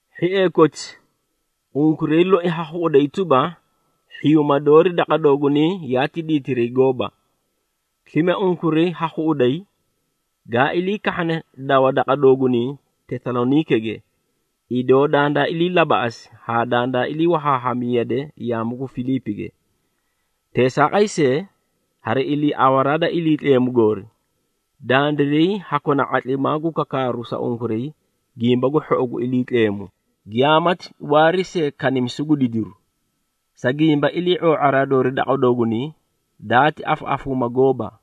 Hhiee koti, unkuray loi ha khuꞌuday tuba, hhiyuuma doori daqa doogunay yaati diitiray gooba. Slime, unkuray ha khuꞌuday, gaa ilii kahhane dawa daqa doogunay Tesaloniikege, idoo dandaa ilii labaꞌasi haa dandaa ilii wahaahami yade yaamu gu Filiipige. Teesaaqay see, hari iliiawaraa da Iliitleemu goori, dandiray haa kona ⁄atlimaa gu kakaaru sa unkuray Gimba gu Hhou gu Iliitleemu, giyaamati waari see kanimisu gu didiru. Sa gimba, ilii⁄oo⁄a doori daqa doogunay, daati afaꞌafuuma gooba,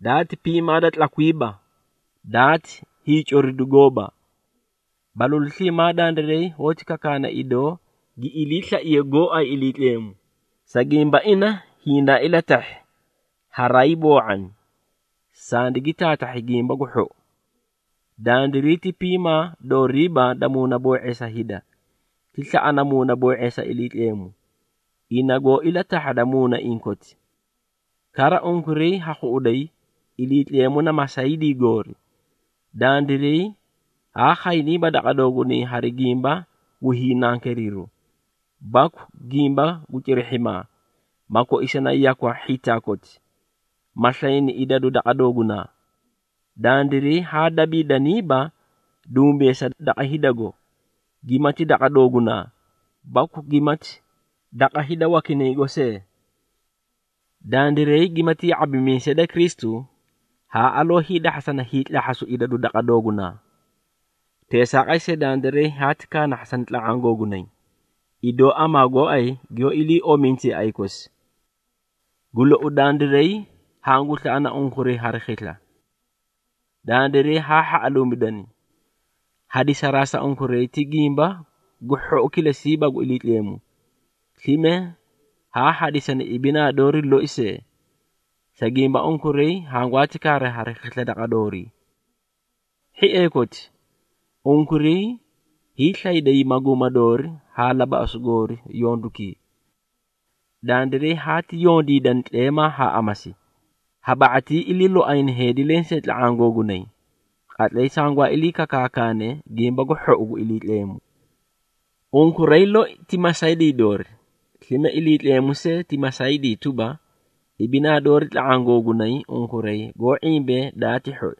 daati piimaa da tlakwiiba, daati hiicoridu gooba. Balalu sliimaa dandiray hoóti kakaana idoo gi iliislaiye gooay Iliitleemu, sa gimba ina hindaa ilatahhi haraay boo⁄ani, sandigi taatahhi Gimbaki gu Hhou. Dandiray ti piimaa dooriiba da muunaboo⁄eesa hida, ti slaꞌana muuna boo⁄eesa Iliitleemu, ina goó ilatahhada muunaiĩ koti. Kara, unkuray ha khuꞌuday, Iliitleemu na masaydii goori, dandiray haa khayniiba daqa doogunay hari gimba gu hiinankeeriru, baku gimba gu cirihhimaa ma koisani yakwa hhitaa koti, ma slayni idadu daqa doogunaa. Dandiray haa dabiidaniiba dumbeesa daqa hidago, gimati daqa doogunaa, baku gimati daqa hida wakinaygo see. Dandiray gimati ya⁄abimiisee da Kristu, haa aloo hiidahhasana hiitlahhasu idadu daqa doogunaa. Teesaaqay see, dandiray haati kaanahhasani tla⁄aã googunay, idoo amaa gooay giyoó ilii ominte yaꞌay kosi. Gu lou, dandiray hangu slaꞌana unkuray hari khisla. Dandiray haa hhaꞌaluumidani, hadisaraa sa unkuray ti Gimba gu Hhou kilesiiba gu Iliitleemu, slime haa hadisani ibinaa doori loi see, sa gimba unkuray hangwaati kaari hari khisla daqa doorii. Hhiee koti, unkuray hiislayday maguuma doori haa labaꞌasu goori yondukii. Dandiray haati yondiidani tleemaa haa amasi, ha ba⁄atii iliiloayna heedi lensee tla⁄aã googunay, qatlay sangwaa ilii kakaakane Gimba gu Hhou gu Iliitleemu. Unkuray loi ti masaydii doori, slime Iliitleemu see ti masaydii tuba, ibinaa doori tla⁄aã googunay unkuray goó ⁄imbee daati hhoi.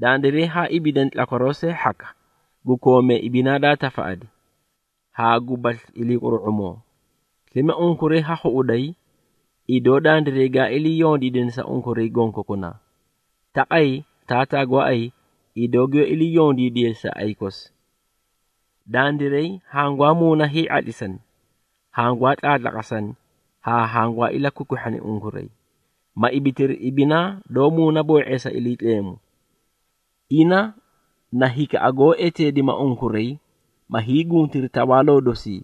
Dandiray haa ibiidani tlakwaroo see hhaka, gu koomee ibinaa daa tafaꞌadi, haa gubasli iliiquru⁄umoo. Slime unkuray ha khuꞌuday, idoo dandiray gaa ilii yondiidani sa unkuray gonkokunaa, taqay taataa gooay, idoo giyoó ilii yondiidiye sa yaꞌay kosi. Dandiray hangwaa muuna hii⁄atlisani, hangwaa tlaatlaqasana haa hangwaa ilakwikwihhani unkuray, ma ibitiri ibinaa doó muunaboo⁄eesa Iliitleemu. Ina na hikaꞌa goó eteedima unkuray, ma hiiguntiri tawaaloo dosii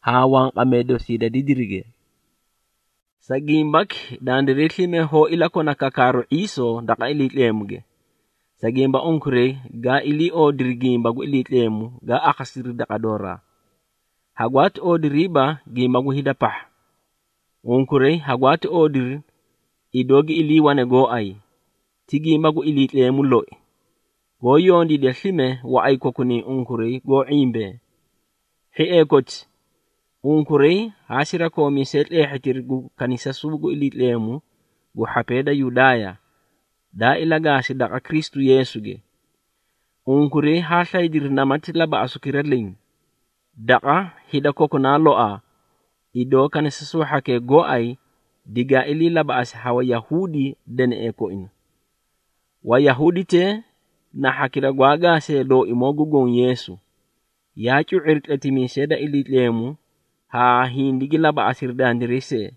haa wanqamee dosii da didirige. Sa gimbaki, dandiray slime hoó ilakona kakaaru ⁄iisoo daqa Iliitleemuge, sa gimba unkuray gaa ilii oodiri gimba gu Iliitleemu gaa akhasidiri daqa dooraa, hagwaati oodiriiba gimba gu hida pahha. Unkuray hagwaati oodiri, idoo gi iliiwane gooay, ti gimba gu Iliitleemu loi, goó yondiida slime waꞌay kokunay unkuray goó ⁄imbee. Hhiee koti, unkuray haa sirakoomiisee tleehhitiri gu kanisasuu gu Iliitleemu gu hhapee da Yudaaya, daa ilagaasi daqa Kristu Yeesuge. Unkuray haa slaydiri namati labaꞌasukira leẽ, daqa hida kokunaa loaa, idoo kanisasuu hhakee gooay digaa ilii labaꞌasi ha Wayahuudi deneꞌee koina. Wayahuuditee na hhakira gwaa gaasee Looimoo gu Goõ Yeesu, yaa cu⁄iri tletimiisee da Iliitleemu haa hindigi labaꞌasiri dandiray see.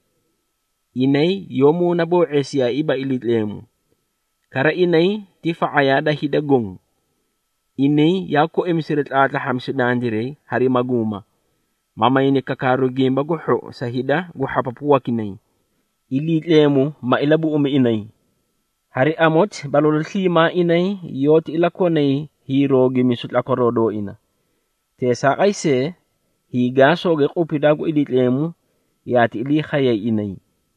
Inay yoó muunaboo⁄eesiyaaiiba Iliitleemu, kara inay ti fa⁄ayaa da hida goõ. Inay yaa koimisiri tlaatlahhamisu dandiray hari maguuma, ma mayni kakaaru Gimba gu Hhou sa hida gu hhapapu wakinay, Iliitleemu ma ilabuꞌumi inay. Hari amoti, balalu sliimaa inay yoóti ilakonay hiiroogimisu tlakwaroo dooina. Teesaaqay see, hiigaasooge qupidaa gu Iliitleemu yaati ilii khayay inay.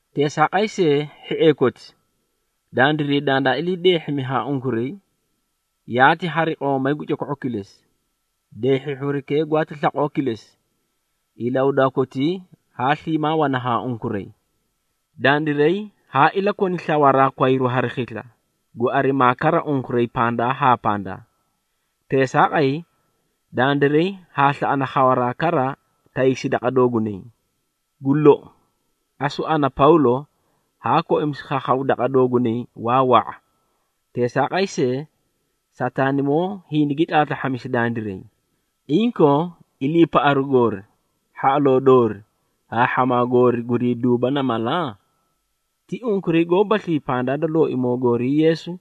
Teesaaqay see, hhiee koti, dandiray dandaa ilii deehhimi haa unkuray, yaati hari qoomay gu coko⁄u kilesi. Deehhihhirukee gwaati slaqoo kilesi, ilahudaa kotii haa sliimaa wana haa unkuray. Dandiray haa ilakoni slawaraa kwayru hari khisla, gu arimaa kara unkuray pandaa haa pandaa. Teesaaqay, dandiray haa slaꞌana khawaraa kara taysi daqa doogunay. Gu lou, asu ana, Pawlo, haa koimisi khakhaw daqa doogunay waa wa⁄a. Teesaaqay see, Sataanimoo hindigi tlaatlahhasi dandiray. Inkoo, iliipaꞌaru goori, hhaꞌaloo doori haa hhamaa goori gurii duuba na mala? Ti unkuray goobaslii pandaa da Looimoo goorii Yeesu,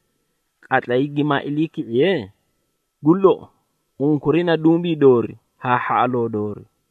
qatlay gimaa iliiki⁄iye? Gu lou, unkuray na dumbii doori haa hhaꞌaloo doori.